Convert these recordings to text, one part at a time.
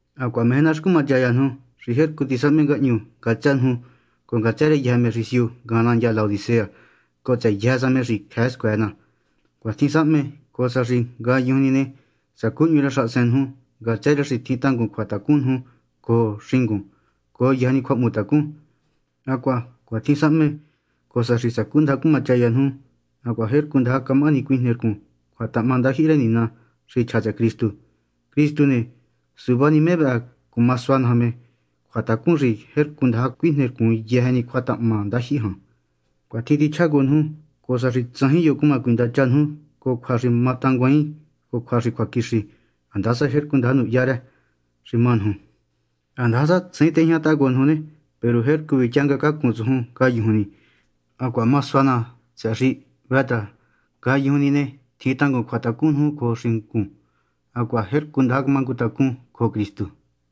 Hacuaha meje ná xi cumachaya nuju xi jercu tisahme ngahñu ngatsë nuju cojo ngatsë rë me xi siu ngajan nandya Laodicea cojo tsëhë yëjë sa me xi cjëë scuëë ná. Cuatjin sahme, cojo sa xi ngayujun ni ne, sacú hñu rë xahasen nuju ngatsë rë xi tjin tangun cjuatacun nuju cojo xingun cojo yëjë ni cjuahmutacun. Hacuaha cuatjin sahme, cojo sa xi sacúndaja cumachaya nuju hacuaha jercu ndaja camahani cuijnercun cjuatahahma ndajyihi rë Nina, xi chja tsëhë Cristu. Cristu ne, suvá ni me vëhë cuma sua naja me cjuatacun xi jercu ndaja cuijnercun yëjë ni cjuatahahma ndajyihi jan. Cuitjin tichjá cojo nuju, cojo sa xi tsajin yo cuma cuindacha nuju cojo cjua xi matanguaain cojo cjua xi cjuaquixi, handasa jercu ndaja nuhya rë, xi má nuju. Handasa tsajin tejñataha cojo nuju ne, peru jercu vityangë cacún tsujun ngayujun ni. Hacuaha ma sua ná, tsëhë xi hvë xi ngayujun ni ne, tjin tangun cjuatacun nuju cojo xingun hacuaha jercu ndaja mangu tacún cojo Cristu.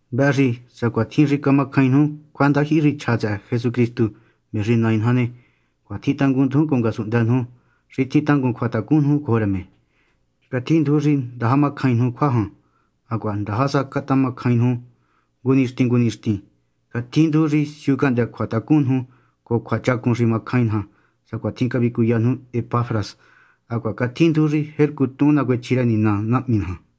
Vëhë xi, sacuatjin xi camacjain nuju cjuandajyihi xi chja tsëhë Jesucristu, me xi Nai naja ne, cuatjin tángunndujun cojo ngasunhndë nuju xi tjin tangun cjuatacun nuju cojo rë me. Catjinduju xi ndaja macjain nuju cjua jan, hacuaha ndaja sa catamacjain nuju ngu nixtin ngu nixtin. Catjinduju xi siu cahndë́ cjuatacun nuju cojo cjuachacun xi macjain naja, sacuatjin cavicuya nuju Epafras. Hacuaha catjinduju xi jercu tuhun nacuechji rë Nina Nahmi naja.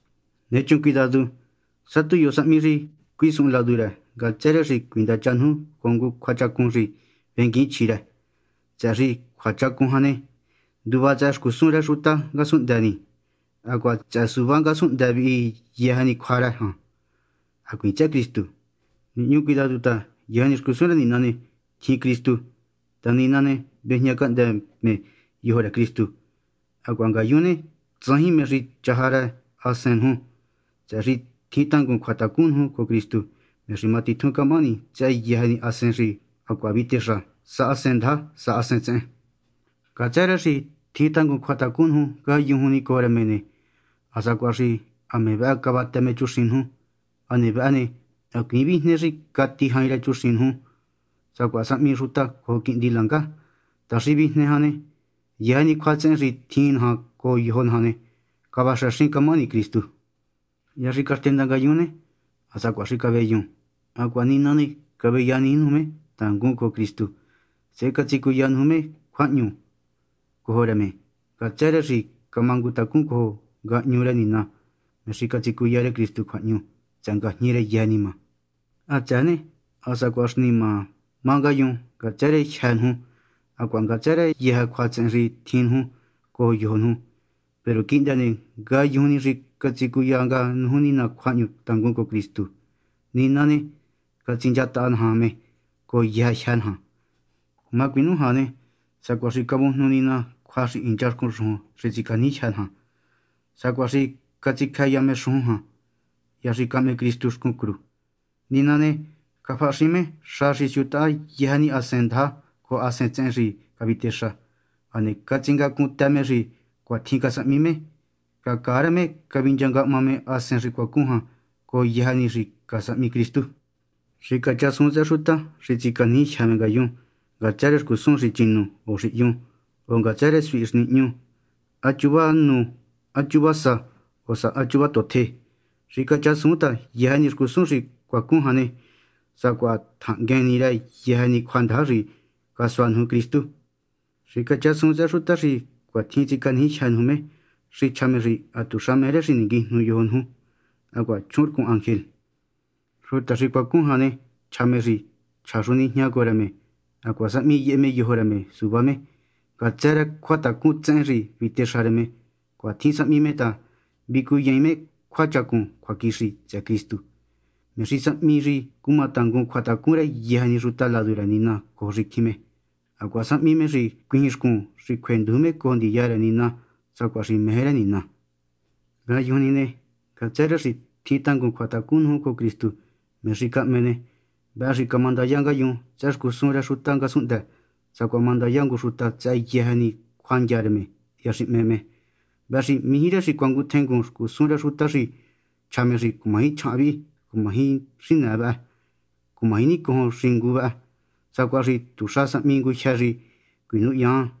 Nechun cuidadu, sá tu yo sahmi xi cuisuhun ladu rë ngatsë rë xi cuindacha nuju cojo ngu cjuachacun xi venguiin chjí rë, tsëhë xi cjuachacun jan ne, nduva tsëhë xcusun rë xuta ngasunhndë ni, hacuaha tsëhë suvá ngasunhndë vihi yëjë ni cjua rë jan, hacuiin tsëhë Cristu. Nihñu cuidadu ta, yëjë xcusun rë Nina ne, tjin Cristu, ta Nina ne, vejñacahndë me yojo rë Cristu, hacuaha ngayun ne, tsajin mé xi chaja rë hasen nuju, tsëhë xi tjin tangun cjuatacun nuju cojo Cristu, me xi matitjun camahani tsëhë yëjë ni hasen xi hacuaha vitexa, sa hasen ndaja sa hasen tsehen. Ngatsë rë xi tjin tangun cjuatacun nuju ngayujun ni cojo rë me ne, ha sacuaha xi me vëhë cavatë me chuxin nuju. Hane vëhë ne, hacuiin vijne xi cati jain chuxin nuju sacuaha sahmi xuta cojo quihndi langa ta xi vijne jan ne, yëjë ni cjuatsehen xi tjin naja cojo yojo naja ne, cavaxëxin camahani Cristu. Hya xi caxtenda ngayun ne, ha sacuaha xi caveyun ne, hacuaha Nina caveyaniji nuju me tangun cojo Cristu, sehe catsicuya nuju me cjuahñu nga cojo rë me, ngatsë rë xi camangu tacún cojo ngahñu rë Nina, me xi catsicuya rë Cristu cjuahñu tsëhë ngajñi rë yëjë nima. Hatsëë ne, ha sacuaha xi nima má ngayun ngatsë rë jyë́ nuju hacuaha ngatsë rë yëjë cjuatsehen xi tjin nuju cojo yojo nuju. Peru quihndë ne, ngayujun ni xi catsicuya nga nuju Nina cjuahñu tangun cojo Cristu, Nina ne, catsinchataha naja me cojo yëjë jyë́ naja. Cuma cuinújan ne, sacuaha xi cavujnu Nina cjua xi hincha xcun xujun xi tsicaniji jyë́ naja. Sacuaha xi catsicjëya me xujun jan, hya xi cahme Cristu xcun cru. Nina ne, cafahaxin me xa xi siutahá yëjë ni hasen ndaja cojo hasen tsehen xi cavitexa, hane catsingacuntë me xi cuatjin casahmi me. Cacaa rë me cavinchangahma me hasen xi cuacun jan, cojo yëjë ni xi casahmi Cristu. Xicachjasuun tsëhë xuta xi tsicanijijyë me ngayun ngatsë rë xcusun xi chinu o xi hyun, o ngatsë rë suhi xi nihñu, há chuva nu, há chuva sá, o há chuva totje. Xicachasuun ta yëjë ni xcusun xi cuacun jan ne, sacuaha tjahnguen ni rë yëjë ni cjuandaja xi casua nuju Cristu. Xicachasuun tsëhë xuta xi cuatjin tsicanijijyë nuju me xi chja me xi hatuxa meje rë xi ninguijnu yojo nuju hacuaha chjuhunrcun ángel. Xuta xi cuacun jan ne, chja me xi chja xu nijñá cojo rë me hacuaha sahmi yehe me yojo rë me suvá me ngatsë rë cjuatacun tsehen xi vitexa rë me. Cuatjin sahmi me ta, vicuyaain me cjuachacun cjuaquixi tsëhë Cristu, me xi sahmi xi cumatangun cjuatacun rë yëjë ni xuta ladu rë Nina cojo xicjin hacuaha sahmi xi cuijin xcun xi cjuenduju me cojo ndiya rë Nina sacuatjin xi meje rë Nina. Ngayujun ni ne, ngatsë rë xi tjin tangun cjuatacun nuju cojo Cristu, me xi cahme ne, vëhë xi camandaya ngayun tsëhë xcusun rë xuta ngasunhndë, sacuaha mandaya ngu xuta tsëhë yëjë ni cjuandya rë me hya xi hme me. Vëhë xi mijí rë xi cuanguntjengun xcusun rë xuta xi chja xi cumaji chjahan vihi, cumaji xinëë vëhë, cumaji nicojon xingu vë, sacuaha xi tuxa sahmi ngujyë xi cuinuhyun jan.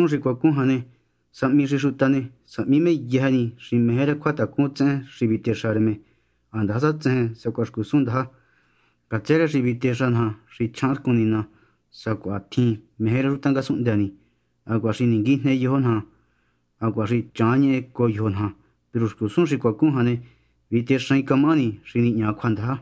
Hacuaha xcusun xi cuacun jan ne, sahmi xi xuta ne, sahmi me yëjë ni xi meje rë cjuatacun tsehen xi vitexa rë me, handasa tsejen sacuaha xcusun ndaja, ngatsë rë xi vitexa naja xi chjahanrcun nina sacuatjin meje rë xuta ngasunhndë ni hacuaha xi ninguijne yojo naja hacuaha xi chjahanñehe cojo yojo naja. Peru xcusun xi cuacun jan ne, vitexaain camahani xi nihña cjuandaja.